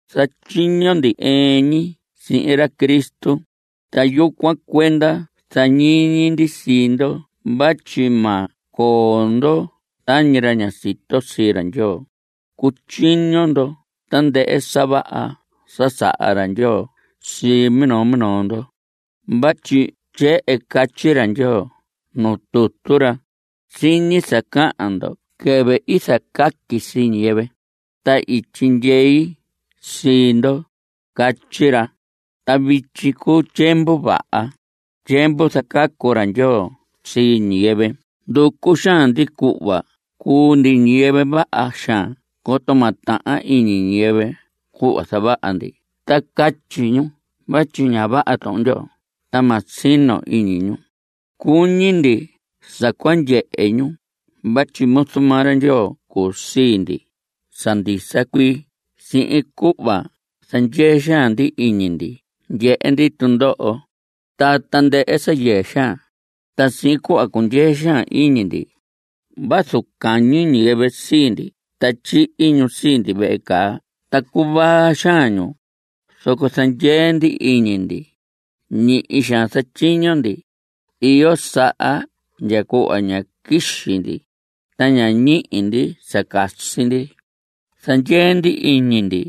Zatyiño ndi ɨɨn ñi sihin ra Cristo, ta yucuan cuenda zañiñi ndi sii ndo vatyi ma coo ndo tañi ra ña sito sii ra Ndyoo. Cutyiño ndo tandɨhɨ sa vaha sa saha ra Ndyoo sii minoo minoo ndo. Vatyi tyehen catyi ra Ndyoo nuu tutu ra: “Siñi sa cahan ndo quɨvɨ i zacaqui sii ñiyɨvɨ, ta i tyindyei sii ndo”, catyi ra. Ta vityi cuu tyiemvu vaha, tyiemvu zacacu ra Ndyoo sii ñiyɨvɨ. Nducu xaan ndi cuhva cuu ndi ñiyɨvɨ vaha xaan coto ma tahan iñi ñiyɨvɨ cuhva zavaha ndi ta catyi ñu vatyi ña vaha Tuhun Ndyoo ta ma sino iñi ñu. Cuñi ndi sa cua ndyehe ñu vatyi muzu maa ra Ndyoo cuu sii ndi sa ndisa cuii sihin cuhva zandyee xaan ndi iñi ndi ndyehe ndi tundoho, ta tandɨhɨ sa yɨɨ xaan. Ta sihin cuhva cundyee xaan iñi ndi. Vazu cañi ñiyɨvɨ sii ndi ta tyihi ñu sii ndi vehe caa ta cuvaa xaan ñu, zoco zandyee ndi iñi ndi. Ñihi xaan zatyiño ndi. Iyo saha ndya cuhva ña quixi ndi, ta ña ñihi ndi sa casi ndi. Zandyee ndi iñi ndi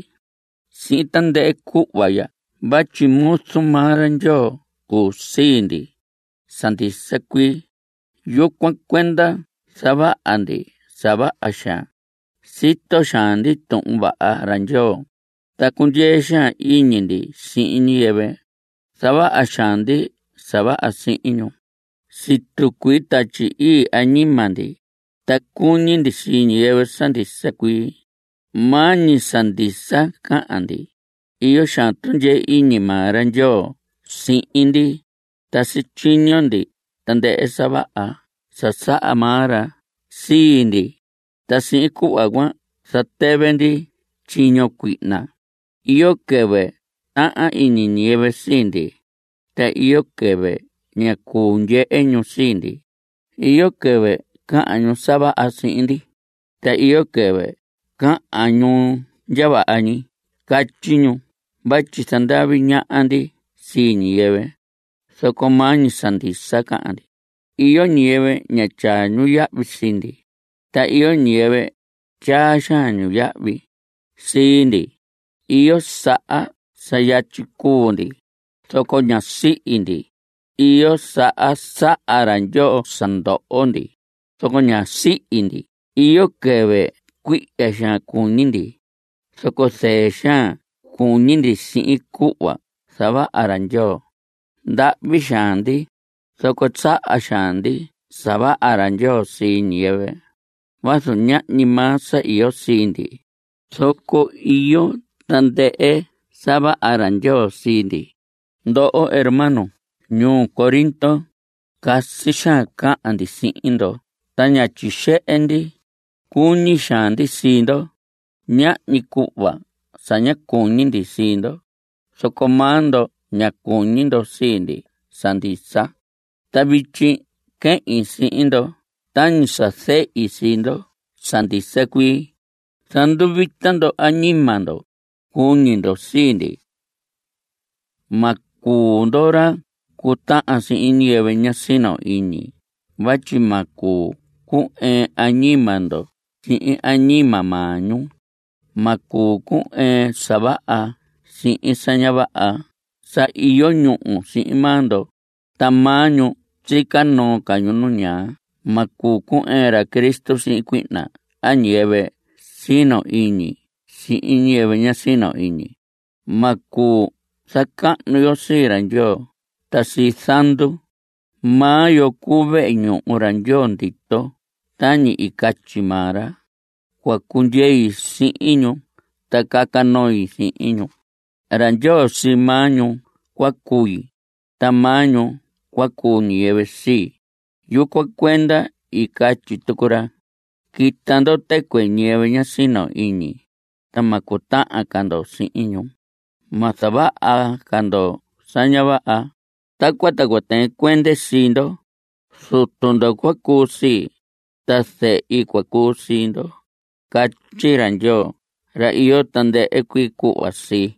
sihin tandɨhɨ cuhva ya vatyi muzu maa ra Ndyoo cuu sii ndi sa ndisa cuii. Yucuan cuenda zavaha ndi sa vaha xaan. Sito xaan ndi Tuhun Vaha ra Ndyoo, ta cundyee xaan iñi ndi sihin ñiyɨvɨ. Zavaha xaan ndi sa vaha sihin ñu. Situ cuii Tatyi Ii añima ndi, ta cuñi ndi sii ñiyɨvɨ sa ndisa cuii. Maa ñi sa ndisa cahan ndi. Iyo xaan tundyee iñi maa ra Ndyoo sihin ndi, ta sityiño ndi tandɨhɨ sa vaha sa saha maa ra sii ndi, ta sihin cuhva cuan zatɨvɨ ndi tyiño cuihna. Iyo quɨvɨ tahan iñi ñiyɨvɨ sii ndi, ta iyo quɨvɨ ña cuu ndyehe ñu sii ndi. Iyo quɨvɨ cahan ñu sa vaha sii ndi, ta iyo quɨvɨ cahan ñu ndya vaha ñi. Catyi ñu vatyi zandavi ñaha ndi sii ñiyɨvɨ, zoco maa ñi sa ndisa cahan ndi. Iyo ñiyɨvɨ ña tyaa ñu yahvi sii ndi, ta iyo ñiyɨvɨ tyaa xaan ñu yahvi sii ndi. Iyo saha sa yatyi cuu ndi, zoco ñá sihi ndi. Iyo saha saha ra Ndyoo sa ndoho ndi, zoco ñá sihi ndi. Iyo quɨvɨ cuihya xaan cuñi ndi, zoco zɨɨ xaan cuñi ndi sihin cuhva zavaha ra Ndyoo. Ndahvi xaan ndi, zoco saha xaan ndi sa vaha ra Ndyoo sii ñiyɨvɨ. Vazu ñahñi maa sa iyo sii ndi, zoco iyo tandɨhɨ sa vaha ra Ndyoo sii ndi. Ndoho hermanos ñuu Corinto, casi xaan cahan ndi sihin ndo ta ña tyixehe ndi. Cuñi xaan ndi sii ndo. Ñahñi cuhva sa ña cuñi ndi sii ndo, zoco maa ndo ña cuñi ndo sii ndi sa ndisa. Ta vityi quehin sihin ndo tañi sa zehi sii ndo sa ndisa cuii. Zanduvita ndo añima ndo. Cuñi ndo sii ndi. Ma cuu ndo ra cu tahan sihin ñiyɨvɨ ña sino iñi vatyi ma cuu cu‑ɨɨn añima ndo sihin añima maa ñu. Ma cuu cu‑ɨɨn sa vaha sihin sa ña vaha. Sa iyo ñúhu sihin maa ndo, ta maa ñu sica noo ca ñu nu ñaa. Ma cuu cu‑ɨɨn ra Cristo sihin cuihna a ñiyɨvɨ sino iñi sihin ñiyɨvɨ ña sino iñi. Ma cuu zacahnu yo sii ra Ndyoo ta sii zandu. Maa yo cuu vehe ñuhu ra Ndyoo ndito tañi i catyi maa ra: Cua cundyei sihin ñu ta caca noi sihin ñu; ra Ndyoo sii maa ñu cua cui, ta maa ñu cua cuu ñiyɨvɨ sii. Yucuan cuenda i catyi tucu ra: Quita ndo tɨcuɨ ñiyɨvɨ ña sino iñi, ta ma cutahan ca ndo sihin ñu; ma zavaha ca ndo sa ña vaha; tacuan ta cua tɨɨn cuende sii ndo. Zutu ndo cua cuu sii, ta zehi cua cuu sii ndo, catyi ra Ndyoo ra iyo tandɨhɨ cuii cuhva sii.